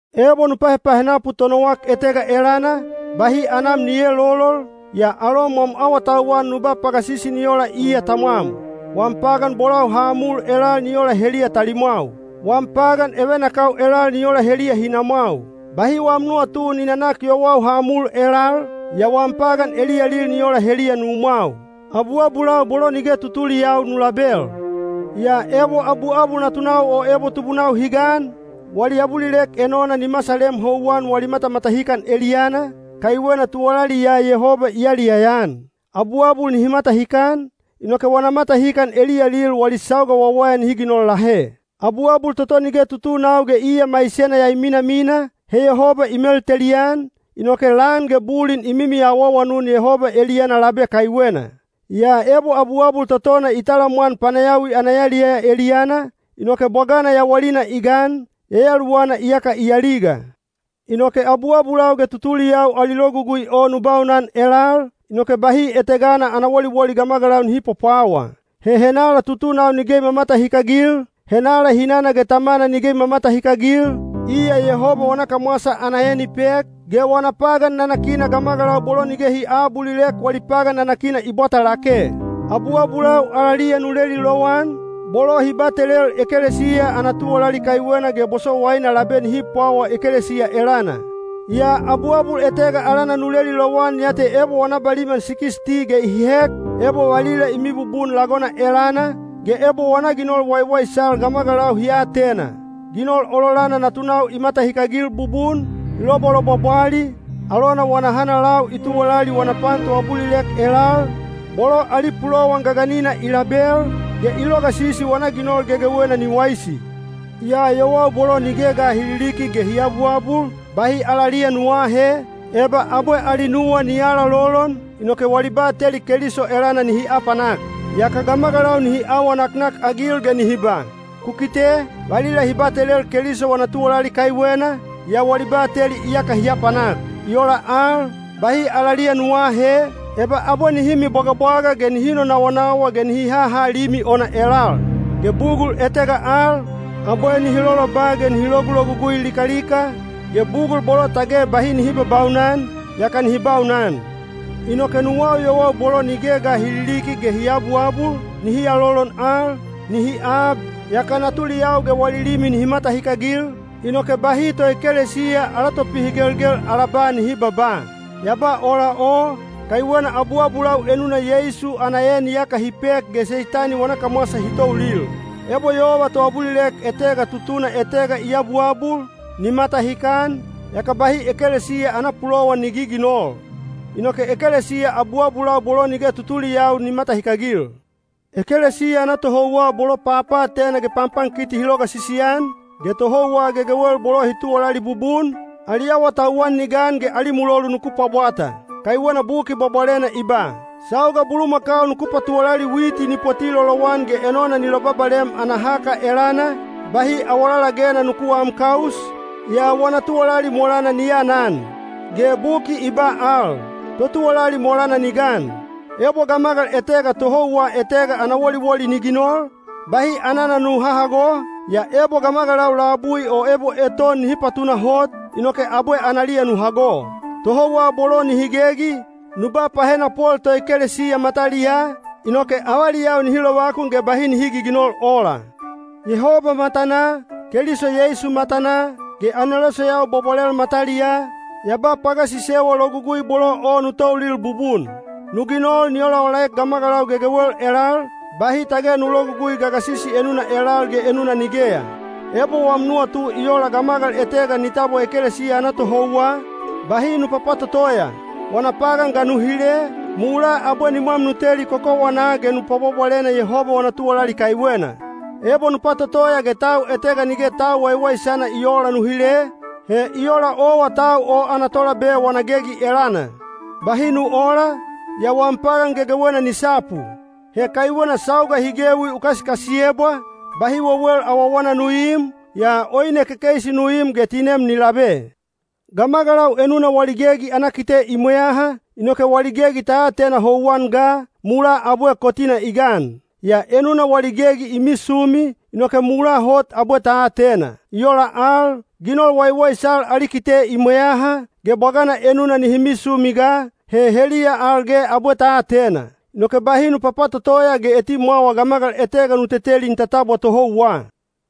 Ebo nu pahepahenapu tonowak etega elana, bahi anam ni eelolol, yaa alom wam awatauwan nu ba pagasisi ni ola iya tamwam. Wam pagan bolau ha mul elal ni ola heliya talimwau. Wam pagan evenakau elal ni ola heliya hinamwau. Bahi wam nuwatu ni nanak yowau ha mul elal, yaa wam pagan eliyalil ni ola heliya numwau. Abuabulau bolo nige tutuliyau nu label. Yaa ebo abuabul natunau o ebo tubunau hi gan, wali abulilek enona ni masalem houwan wali matamatahikan eliyana, kaiwena tuwalali ya Yehoba i yaliyaya-an. Abuabul nihi matahikan, inoke wana matahikan eliyalil wali sauga wawaya nihi ginol lahe. Abuabul toto nige tutunau ge iya maisena ya i minamina, he Yehoba i meltelian, inoke lan ge bulin i mimi awaawanun Yehoba eliyana labe kaiwena. Yaa ebo abuabul totona i talamwan panayawi ana yaliyaya eliyana, inoke bwagana yawalina i gan, yayaluwana iyaka i aliga. Inoke abuabulau ge tutuliyau ali logugui o nu baunan elal, inoke bahi etegana ana woliwoli gamagalau nihi pwapwawa. He henala tutunau nige i mamatahikagil, henala hinana ge tamana nige i mamatahikagil, iya Yehoba wana kamwasa ana en i pek, ge wana pagan nanakina gamagalau bolo nige hi aabulilek wali pagan nanakina i bwata lake. Abuabulau alaliya nu leli lowan, bolo hi batelel ekelesiya ana tuwalali kaiwena ge bosowaina labe nihi pwawa ekelesiya elana. Yaa abuabul etega alana nu leli lowan ya te ebo wana baliman sikisti ge i hek, ebo valila i mibubun lagona elana, ge ebo wana ginol waiwaisal gamagalau hi atena: ginol ololana natunau i matahikagil bubun, i lobwalobwabwali, alona wana hanalau i tuwalali wana pan toabulilek elal, bolo ali pulowan gaganina i label, ge i logasisi wana ginol gegewena ni waisi. Yaa yowau bolo nige ga hi liliki ge hi abuabul, bahi alaliya nu aahe, eba abwe ali nuwa ni alalolon, inoke wali bateli Keliso elana nihi apanak. Yaka gamagalau nihi awa naknakagil ge nihi ba, “Ku kite, valila hi batelel Keliso wana tuwalali kaiwena, yaa wali bateli iyaka hi apanak.” I ola al, bahi alaliya nu aahe, eba abwe nihi mibwagabwaga ge nihi nonawanawa ge nihi haha limi ona elal. Ge bugul etega al, abwe nihi loloba ge nihi logulogugui likalika, ge bugul bolo tage bahi nihi babaunan, yaka nihi baunan. Inoke nuwau yowau bolo nige ga hi liliki ge hi abuabul, nihi alolon al, nihi ab, yaka natuliyau ge wali limi nihi matahikagil, inoke bahi toekelesiya ala topihigelgel ala ba nihi babaa. Ya ba ola o, kaiwena abuabulau enuna Yeisu ana en iyaka hi pek ge Seitani wana kamwasa hi toulil. Ebo yova toabulilek etega tutuna etega i abuabul, ni matahikan, yaka bahi ekelesiya ana pulowan ni giginol. Inoke ekelesiya abuabulau bolo nige tutuliyau ni matahikagil. Ekelesiya ana tohouwa bolo papaatena ge panpankiti hi logasisi-an, ge tohouwa gegewel bolo hi tuwalali bubun, ali awatauwan ni gan ge ali mulolu nuku pwabwata. Kaiwena Buki Bwabwalena i ba, “Sauga bulumakau nuku patuwalali witi ni poti lolowan ge enona ni lobabalem ana haka elana, bahi awalalagena nuku aam kaus, yaa wana tuwalali molana ni anan.” Ge Buki i ba al, “Totuwalali molana ni gan.” Ebo gamagal etega tohouwa etega ana woliwoli ni ginol, bahi anana nu hahago, yaa ebo gamagalau labui o ebo eton nihi patunahot, inoke abwe analiya nu hago. Tohouwa bolo nihi gegi, nu ba pahenapol toekelesiya mataliyaa, inoke avaliyau nihi lovakun ge bahi nihi giginol ola. Yehoba matanaa, Keliso Yeisu matanaa, ge aneloseyau bwabwalel mataliyaa, ya ba pagasisewa logugui bolo o nu toulil bubun. Nu ginol ni olaolaek gamagalau gegewel elal, bahi tage nu logugui pagasisi enuna elal ge enuna nigeya. Ebo wam nuwatu i ola gamagal etega ni tabwa ekelesiya ana tohouwa, bahi nu papatotoya. Wana pagan ga nu hile, mulaa abwe nimwam nu teli kokowanaa ge nu pwabwabwalena Yehoba wana tuwalali kaiwena. Ebo nu patotoya ge tau etega nige tau waiwaisana i oola nu hile, he i ola owa tau o ana tolabe wana gegi elana. Bahi nu oola, yaa wam pagan gegewena ni sapu. He kaiwena sauga hi gewi u kasikasiyebwa, bahi wewel awawana nu iim, yaa oine kekeisi nu im ge tinem ni labe. Gamagalau enuna wali gegi ana kite i mweyaha, inoke wali gegi ta atena houwan ga, mulaa abwe kotina i gan. Yaa enuna wali gegi i misumi, inoke mulaa hot abwe ta atena. I ola al, ginol waiwaisal ali kite i mweyaha, ge bwagana enuna nihi misumi ga, he heliya al ge abwe ta atena. Inoke bahi nu papatotoya ge etimwawa gamagal etega nu teteli ni tatabwa tohouwa.